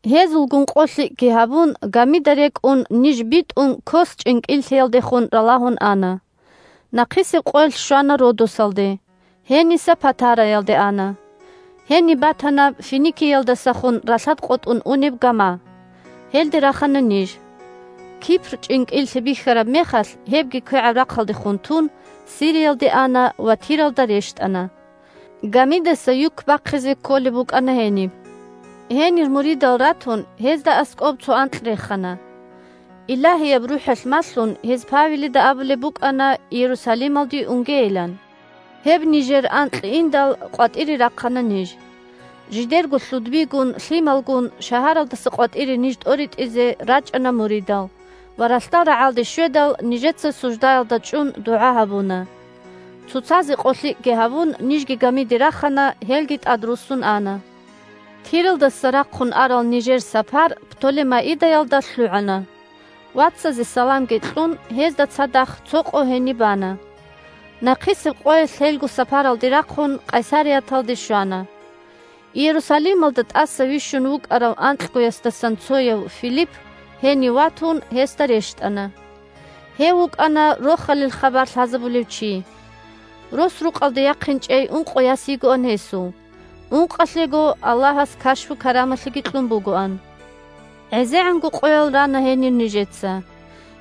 Гьезулгун къолъикӀги гьабун, гамида рекӀун ниж битӀун Кос чӀинкӀиллъиялдехун ралагьун ана. Нахъисеб къоялъ щвана Родосалде, гьениса Патараялде ана. Гьениб батана Финикиялдасахун ралъад къотӀун унеб гама. Гьелде рахана ниж. Кипр чӀинкӀиллъи бихьараб мехалъ, гьебги квегӀаб рахъалдехун тун, Сириялде ана ва Тиралда рещтӀана. Гамидаса юк бахъизе кколеб букӀана гьениб. Гьенир муридал ратун, гьезда аскӀоб цо анкь рехана. Илагьияб РухӀалъ малъун, гьез Павелида абулеб букӀана Иерусалималде унгейилан. Гьеб нижер анкь индал, къватӀире рахъана ниж. Жидерго лъудбигун, лъималгун шагьаралдаса къватӀире ниж тӀоритӀизе рачӀана муридал, ва ралъдал рагӀалде щведал, нижеца суждаялда чӀун дугӀа гьабуна. Цоцазе къолъикӀги гьабун, нижги гамиде рахана, гьелги тӀадруссун ана. Тиралдаса рахъун арал нижер сапар Птолемаидаялда лъугӀана. Вацазе саламги кьун, гьезда цадахъ цо къо гьениб бана. Нахъисеб къоялъ лъелго сапаралде рахъун, Къайсарияталде щвана. Иерусалималда тӀаса вищун вукӀарав анкьгоясдасан цояв – Филипп – гьенив ватун, гьесда рещтӀана. Гьев вукӀана Рохалил хабар лъазабулев чи. Рос-рукъалде яхъинчӀей ункъо яс йигоан гьесул, ункъалъего Аллагьас кашпу-карамалъиги кьун бугоан. ГӀезегӀанго къоял рана гьенир нижеца.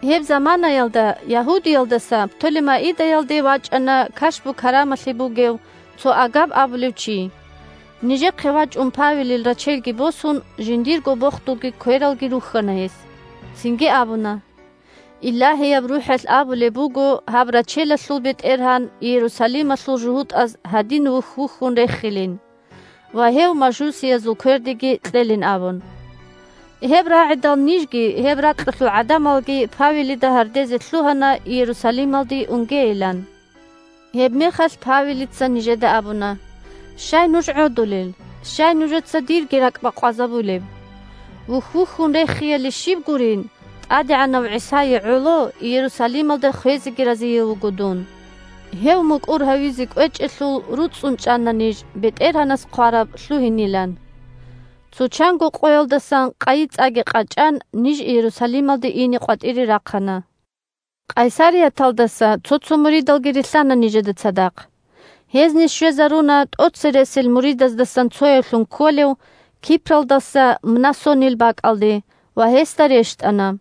Гьеб заманаялда Ягьудиялдаса Птолемаидаялде вачӀана кашпу-карамалъи бугев цо Агаб абулев чи. Нижехъе вачӀун Павелил рачелги босун, жиндирго бохдулги квералги рухьана гьес. Цинги абуна: – Илагьияб РухӀалъ абулеб буго гьаб рачелалъул бетӀергьан Иерусалималъул жугьутӀаз гьадин вухь-вухьун рехилин ва гьев мажусиязул квердеги кьелин абун. Гьеб рагӀидал нижги гьеб ракьалъул гӀадамалги Павелида гьардезе лъугьана Иерусалималде унгейилан. Гьебмехалъ Павелица нижеда абуна: – Щай нуж гӀодулел? Щай нужеца дирги ракӀ бакъвазабулеб? Вухь-вухьун рехияли щиб гурин, ТӀадегӀанав ГӀисае гӀоло Иерусалималда хвезеги разияв вуго дун. Гьев мукӀур гьавизе кӀвечӀелъул, руцӀцӀун чӀана ниж БетӀергьанас хъвараб лъугьинилан. Цо чанго къоялдасан къайи-цӀаги къачӀан, ниж Иерусалималде ине къватӀире рахъана. Къайсарияталдаса цо-цо муридалги рилълъана нижеда цадахъ. Гьез ниж щвезаруна тӀоцересел муридаздасан цоявлъун кколев Кипралдаса Мнасонил бакӀалде ва гьесда рещтӀана.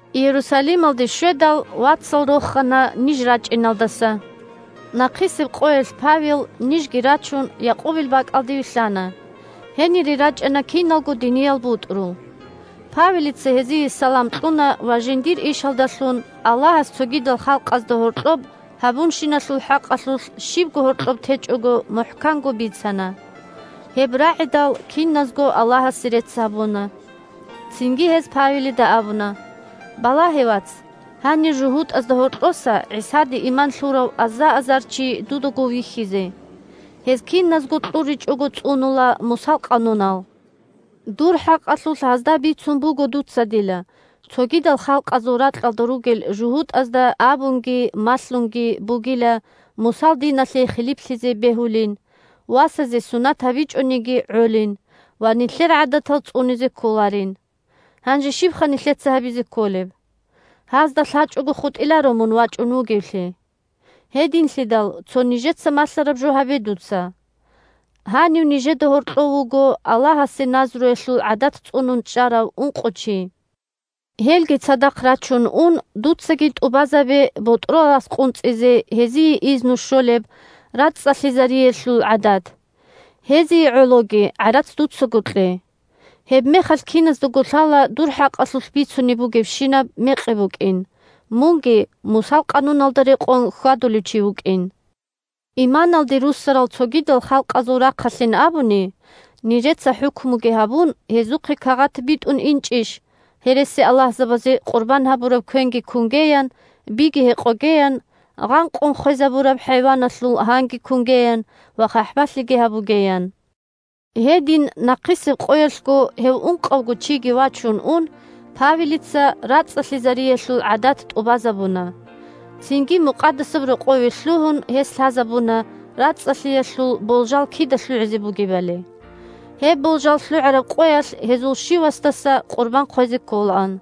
Иерусалималде щведал, вацал рохана ниж рачӀиналдаса. Нахъисеб къоялъ Павел, нижги рачун, Якъубил бакӀалде вилълъана. Гьенире рачӀана киналго диниял бутӀрул. Павелица гьезие салам кьуна ва жиндир ишалдалъун Аллагьас цогидал халкъазда гьоркьоб гьабунщиналъул хӀакъалъулъ щибго гьоркьоб течӀого мухӀканго бицана. Гьеб рагӀидал, киназго Аллагьасе рецц гьабуна. Цинги гьез Павелида абуна: – Балагье, вац, гьанир жугьутӀазда гьоркьоса ГӀисаде иман лъурав аза-азар чи дудаго вихьизе. Гьез киназго кьуричӀого цӀунула Мусал къанунал. Дур хӀакъалъулъ гьазда бицун буго дуцадила, цогидал халкъазул ракьалда ругел жугьутӀазда абунги малъунги бугила Мусал диналъе хилиплъизе бегьулин, васазе сунат гьабичӀониги гӀолин ва нилъер гӀадатал цӀунизе кколарин. Гьанже щибха нилъеца гьабизе кколеб? Гьазда лъачӀого хутӀиларо мун вачӀун вугевлъи. Гьединлъидал цо нижеца малъараб жо гьабе дуца: гьанив нижеда гьоркьов вуго Аллагьасе назруялъул гӀадат цӀунун чӀарав ункъо чи. Гьелги цадахъ рачун ун, дуцаги тӀубазабе ботӀрол рас къунцӀизе гьезие изну щолеб рацӀцӀалъизариялъул гӀадат. Гьезие гӀологи гӀарац дуцаго кье. Гьебмехалъ киназдаго лъала дур хӀакъалъулъ бицунеб бугебщинаб мекъи букӀин, мунги Мусал къануналда рекъон хьвадулев чи вукӀин. Иманалде руссарал цогидал халкъазул рахъалъин абуни, нижеца хӀукмуги гьабун, гьезухъе кагъат битӀун инчӀищ гьересиаллагьзабазе къурбан гьабураб квенги кунгеян, биги гьекъогеян, гъанкъун хвезабураб хӀайваналъул гьанги кунгеян ва хъахӀбалъиги гьабугеян. Гьедин нахъисеб къоялъго гьев ункъавго чиги вачун ун, Павелица рацӀцӀалъизариялъул гӀадат тӀубазабуна. Цинги Мукъадасаб Рокъове лъугьун, гьес лъазабуна рацӀцӀалъиялъул болжал кида лъугӀизе бугебали. Гьеб болжал лъугӀараб къоялъ гьезул щивасдаса къурбан хъвезе кколаан.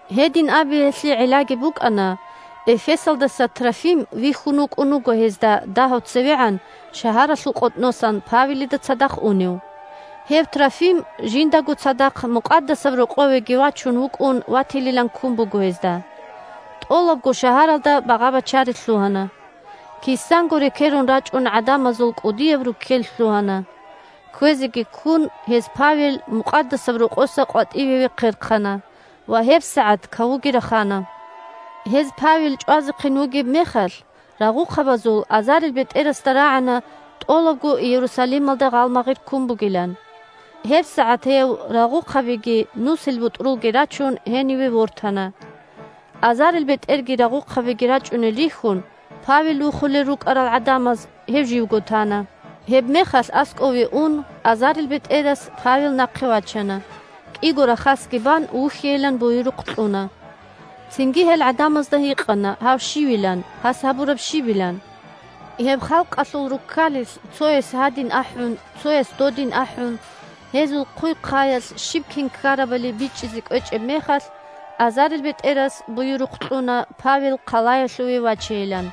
Гьедин абиялъе гӀиллаги букӀана: Эфесалдаса Трофим вихьун вукӀун вуго гьезда дагьав цевегӀан шагьаралъул къотӀносан Павелида цадахъ унев. Гьев Трофим жиндаго цадахъ Мукъадасаб Рокъовеги вачун вукӀун ватилилан ккун буго гьезда. ТӀолабго шагьаралда багъа-бачари лъугьана. Кисанго рекерун рачӀун гӀадамазул кӀудияб руккел лъугьана. Кквезеги ккун, гьез Павел Мукъадасаб Рокъоса къватӀиве вехъерхъана, ва гьебсагӀат кавуги рахана. Гьез Павел чӀвазехъин вугеб мехалъ, рагъухъабазул азарилбетӀерасда рагӀана тӀолабго Иерусалималда гъалмагъир ккун бугилан. ГьебсагӀат гьев, рагъухъабиги нусилбутӀрулги рачун, гьениве вортана. АзарилбетӀерги рагъухъабиги рачӀунел рихьун, Павел вухулел рукӀарал гӀадамаз гьев живго тана. Гьебмехалъ аскӀове ун, азарилбетӀерас Павел нахъе вачана, кӀиго рахасги бан вухьейилан буюрухъ кьуна. Цинги гьел гӀадамазда гьикъана гьав щивилан, гьас гьабураб щибилан. Гьеб халкъалъул руккалилъ цояс гьадин ахӀун, цояс додин ахӀун, гьезул хъуй-хъаялъ щиб-кин ккарабали бичӀчӀизе кӀвечӀеб мехалъ, азарилбетӀерас буюрухъ кьуна Павел хъалаялъуве вачейилан.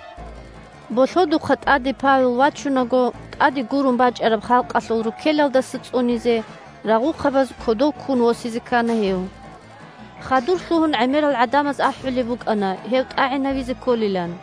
Болъодухъа тӀаде Павел вачунаго, тӀаде гурун бачӀараб халкъалъул руккелалдаса цӀунизе, рагъухъабаз кодов ккун восизе ккана гьев. Хадур лъугьун гӀемерал гӀадамаз ахӀулеб букӀана гьев тӀагӀинавизе кколилан.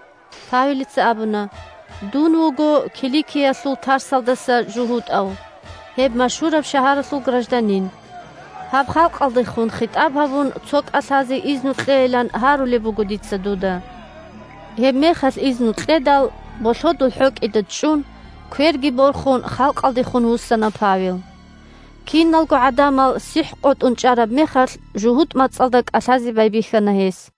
Павелица абуна: – Дун вуго Киликиялъул Тарсалдаса жугьутӀав, гьеб машгьураб шагьаралъул гражданин. Гьаб халкъалдехун хитӀаб гьабун, цо кӀалъазе изну кьейилан гьарулеб буго дица дуда. Гьебмехалъ изну кьедал, болъодул хӀокӀида чӀун, кверги борхун, халкъалдехун вуссана Павел. Киналго гӀадамал сихӀкъотӀун чӀараб мехалъ, жугьутӀ мацӀалда кӀалъазе байбихьана гьес.